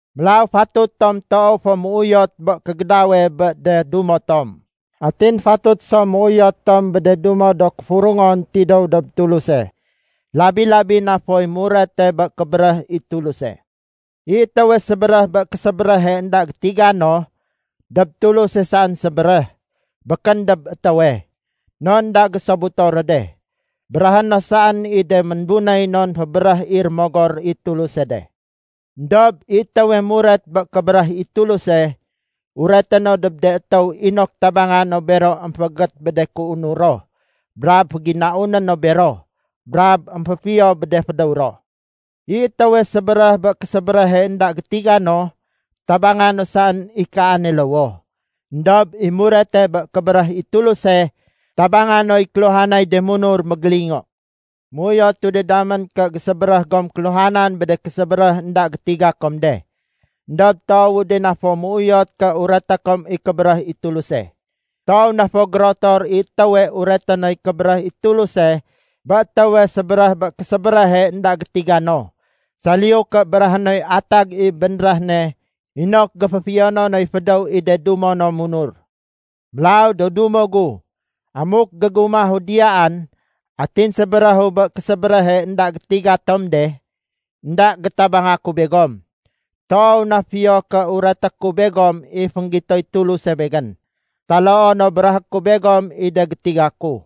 Mélaw fatut tom toow fo méuyot bé kégédawe bé de dumo tom. Atin fatut so méuyot tom bé de dumo do kéfurungon tidéw dob Tuluse. Labi-labi na foy murete bé kébéréh i Tuluse. I étéwe sébéréh bé késébéréhe énda gétiga no, dob Tuluse saén sébéréh, békén dob étéwe. Non énda gésobuto ro de. Béréhé no saén i de ménbunéy non fébéréh i Rémogor i Tuluse de. Endob i étéwe muret bé kébéréh i Tuluse, ureté no dob de étéw inok tabanga no bero émféégét bé de kéunur ro brab féginauné no bero, brab émféfiyo bé de fédéw ro. I étéwe sébéréh bé késébéréhe énda gétiga no, tabanga no saén i kaane lowoh. Endob i murete bé kébéréh i Tuluse, tabanga noy kéluhanay de munur mégélingo. Méuyotu de damén ké gésébéréh gom kéluhanan bé de késébéréh énda gétiga kom de, éndob toowu de na fo méuyot ké ureté kom i kébéréh i Tuluse. Toow na fo gérotor i étéwe ureté noy kébéréh i Tuluse bé étéwe sébéréh bé késébéréhe énda gétiga no, saliyu ké béréhé noy atag i bénréh ne inok géféfiyono noy fédéw i de dumo no munur. Mélaw do dumo gu, amuk gégumahu diyaan atin sébéréhu bé késébéréhe énda gétiga tom de, énda gétabanga ku begom. Toow na fiyo ké ureté ku begom i fénggitoy Tuluse begén, taloo no béréhé ku begom i de gétiga ku,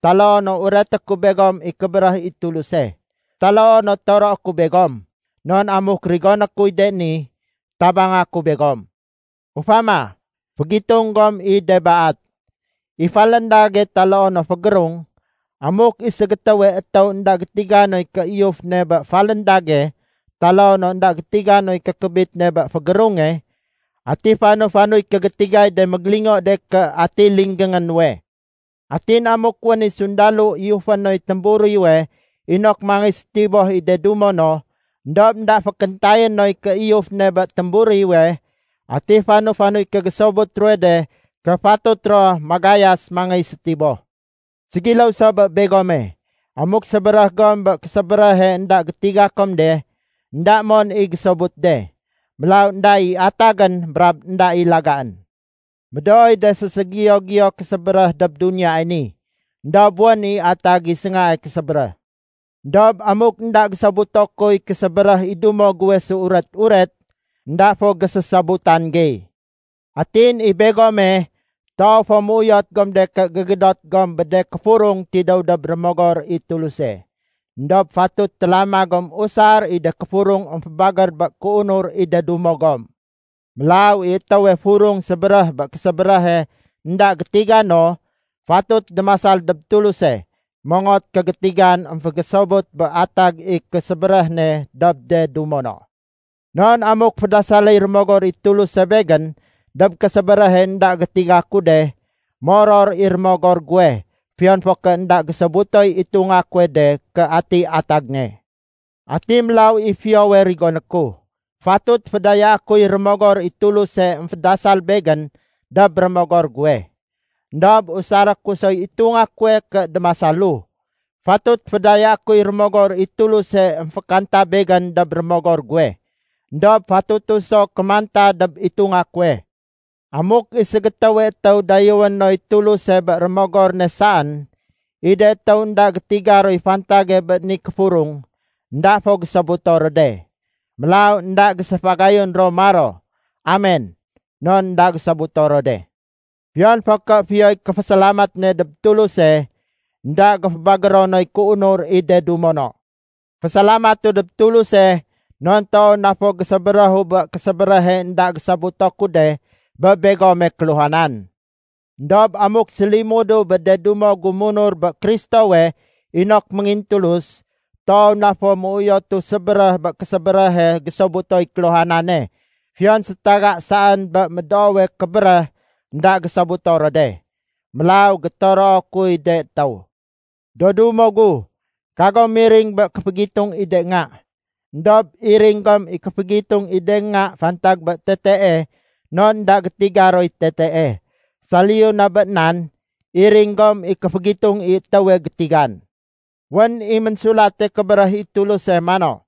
taloo no ureté ku begom i kébéréh i Tuluse, taloo no toroé ku begom. Non amuk rigoné kuy de ni, tabanga ku begom. Ufama, fégitung gom i de baat. I faléndage taloo no fégérung, amuk i ségétéwe étéw énda gétiga noy kéiyuf ne bé faléndage taloo no énda gétiga noy kékébit ne bé fégérunge, ati fanu-fanuy kégétigay de mégélingo de ké atiy linggéngé nuwe. Atin amuk wén i sundalo iyufé noy témburiwe inok mangéy sétiboh i de dumo no, éndob énda fékéntayé noy kéiyuf ne bé témburiwe, ati fanu-fanuy kégésobut ruwe de ké fatut ro magayas mangéy sétiboh. Ségiléw so bé begome, amuk sébéréh gom bé késébéréhe énda gétiga kom de, énda mon i gésobut de. Mélaw énda i atagén brab énda i lagaén. Médooy de séségiyo-giyo do késébéréh dob duniyae ni, éndob wén i atag i séngae késébéréh. Endob amuk énda gésobuto kuy késébéréh i dumo guwe séuret-uret, énda fo gésésobutan gey. Atin i begome, toow fo méuyot gom de ké gégédot gom bé de kéfurung tidéw dob Rémogor i Tuluse. Endob fatut télama gom usar i de kéfurung émfébagér bé kéunur i de dumo gom. Mélaw i étéwe furung sébéréh bé késébéréhe énda gétiga no, fatut démasal dob Tuluse mongot kégétigan émfégésobut bé atag i késébéréh ne dob de dumo no. Non amuk fédasaléy Rémogor i Tuluse begén dob késébéréhe énda gétiga ku de, moror i rémogor guwe fiyon fo ké énda gésobutoy itunga kuwe de ké atiy atag ne. Ati mélaw i fiyowe rigoné ku? Fatut fédayaé kuy Rémogor i Tuluse émfédasal begén dob rémogor guwe. Endob usaré ku soy itunga kuwe ké démasalu. Fatut fédayaé kuy Rémogor i Tuluse émfékanta begén dob rémogor guwe, éndob fatutu so kémanta dob itunga kuwe. Amuk i ségétéwe étéw dayéwé noy Tuluse bé rémogor ne saén, i de étéw énda gétiga roy fantage bé ni kéfurung, énda fo gésobuto ro de. Mélaw énda géséfagayun ro maro, “Amen” non énda gésobuto ro de. Fiyon fo ké fiyoy kéfésalamat ne dob Tuluse, énda géfébagéro noy kéunur i de dumo no. Fésalamatu dob Tuluse, non toow na fo gésébéréhu bé késébéréhe énda gésobuto ku de bé begome kéluhanan. Endob amuk sélimudu bé de dumo gu munur bé Kristowe inok méngintulus, toow na fo méuyotu sébéréh bé késébéréhe gésobutoy kéluhanane fiyon sétaga saén bé médoowe kébéréh énda gésobuto ro de. Mélaw gétoroo kuy de étéw. Do dumo gu, kagom miring bé kéfégitung i de nga. Endob iring gom i kéfégitung i de nga fantag bé tetee non énda gétiga roy tetee. Saliyu na bé nan, iring gom i kéfégitung i étéwe gétigan. Wén i Ménsulate Kébéréh i Tuluse mano,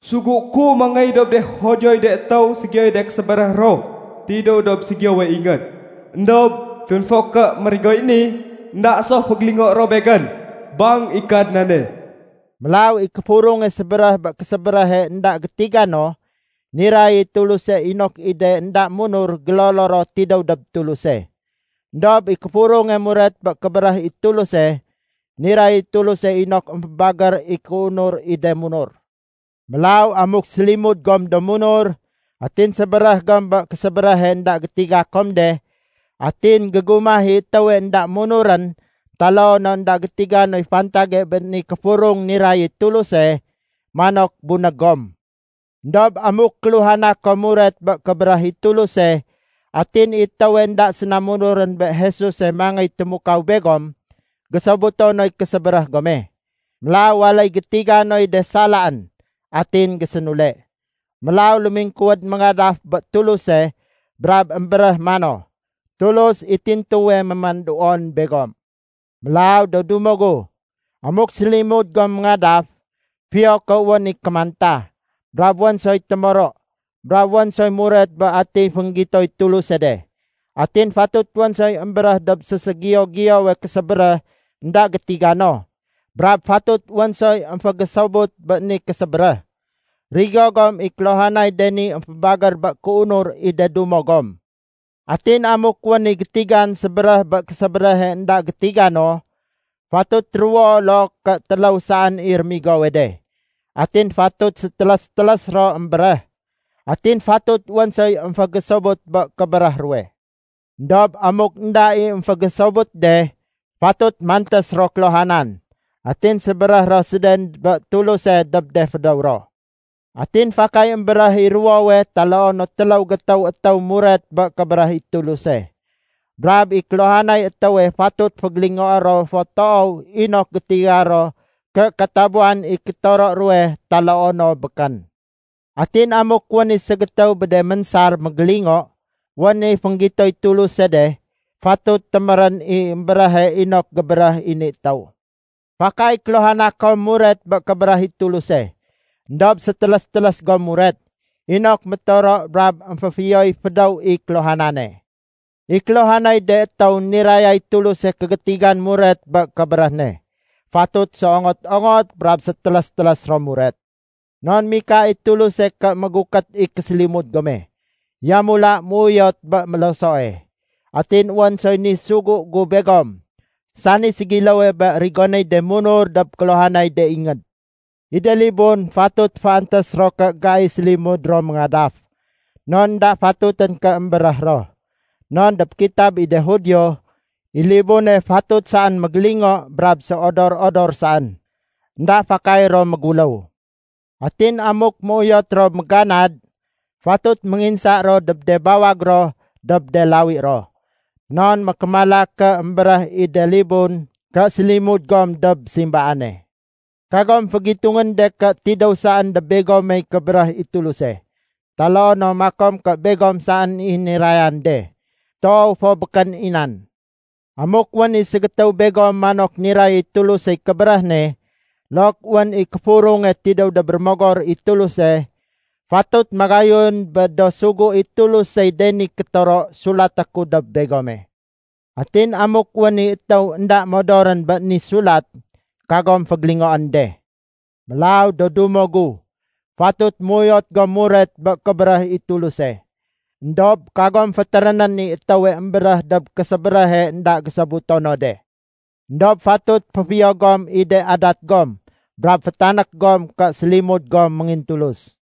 “Sugué ku mangéy dob de Judioy de étéw ségiyoy de késébéréh ro tidéw dob ségiyowe ingéd. Endob fiyon fo ké mérigoy ni, énda so fégélingoé ro Begén, bang i Kadnane.” Mélaw i kéfurunge sébéréh bé késébéréhe énda gétiga no, niray i Tuluse inok i de énda munur gélolo ro tidéw dob Tuluse. Endob i kéfurunge muret bé kébéréh i Tuluse, niray i Tuluse inok émfébagér i kéunur i de munur. Mélaw amuk sélimud gom do munur, atin sébéréh gom bé késébéréhe énda gétiga kom de, atin gégumah i étéwe énda munurén taloo no énda gétiga noy fantage bé ni kéfurung niray i Tuluse, manok bunég gom. Endob amuk kéluhana kom muret bé kébéréh i Tuluse, atin i étéwe énda séna munurén bé Jesuse ménangéy témukaw begom, gésobuto noy késébéréh gome. Mélaw waléy gétiga noy de salaén, atin gésénule. Mélaw lémingkuwéd méngadaf bé Tuluse brab émbéréh mano, “Tulus i tintuwe mémanduon begom.” Mélaw do dumo gu, amuk sélimud gom méngadaf, fiyo ké wén i kémanta, brab wén soy témoro, brab wén soy muret bé atiy fénggitoy Tuluse de. Atin fatut wén soy émbéréh dob séségiyo-giyowe késébéréh énda gétiga no, brab fatut wén soy émfégésobut bé ni késébéréh. Rigo gom i kéluhanay de ni émfébagér bé kéunur i de dumo gom. Atin amuk wén i gétigan sébéréh bé késébéréhe énda gétiga no, fatut ruwo loo ké téléw saén i rémigowe de. Atin fatut sétélés-télés ro émbéréh. Atin fatut wén soy émfégésobut bé kébéréh ruwe. Endob amuk énda i émfégésobut de, fatut mantés ro kéluhanan atin sébéréh ro séden bé Tuluse dob de fédéw ro. Atin fakay émbéréh i ruwowe taloo no téléw gétéw étéw muret bé kébéréh i Tuluse. Brab i kéluhanay étéwe fatut fégélingoé ro fo toow inok gétiga ro ké katabuwan i kétoro ruwe taloo no békén. Atin amuk wén i ségétéw bé de ménsar mégélingo, wén i fénggitoy Tuluse de, fatut témérén i émbéréhe inok gébéréh i ni étéw. Fakay kéluhana kom muret bé kébéréh i Tuluse, éndob sétélés-télés gom muret, inok métoro brab émféfiyoy fédéw i kéluhanane. I kéluhanay de étéw nirayay Tuluse kégétigan muret bé kébéréh ne, fatut séongot-ongot brab sétélés-télés ro muret. Non mika i Tuluse ké mégukét i késélimud gome, yamula méuyot bé mélosoe. Atin wén soy ni sugu gu begom, sani ségiléwe bé rigonéy de munur dob kéluhanay de ingéd. I de libun fatut féantés ro ké gai sélimud ro méngadaf, non énda fatutén ké émbéréh ro. Non dob kitab i de Judio, i libune fatut saén mégélingo brab séodor-odor saén. Enda fakay ro méguléw. Atin amuk méuyot ro méganad, fatut ménginsa ro dob de bawag ro dob de lawi ro, non mékémala ké émbéréh i de libun ké sélimud gom dob simbaane. Kagom fégitungén de ké tidéw saén dob begomey kébéréh i Tuluse, taloo no makom ké begom saén i nirayan de. Toow fo békén i nan. Amuk wén i ségétéw begom manok niray i Tulusey kébéréh ne, look wén i kéfurunge tidéw dob Rémogor i Tuluse, fatut magayun bé do sugu i Tulusey de ni kétoro sulaté ku dob begome. Atin amuk wén i étéw énda modorén bé ni sulat, kagom fégélingoén de. Mélaw do dumo gu, fatut méuyot gom muret bé kébéréh i Tuluse. Endob kagom fétérénén i étéwe émbéréh dob késébéréhe énda gésobuto no de. Endob fatut féfiyo gom i de adat gom brab fétanék gom ké sélimud gom méngintulus.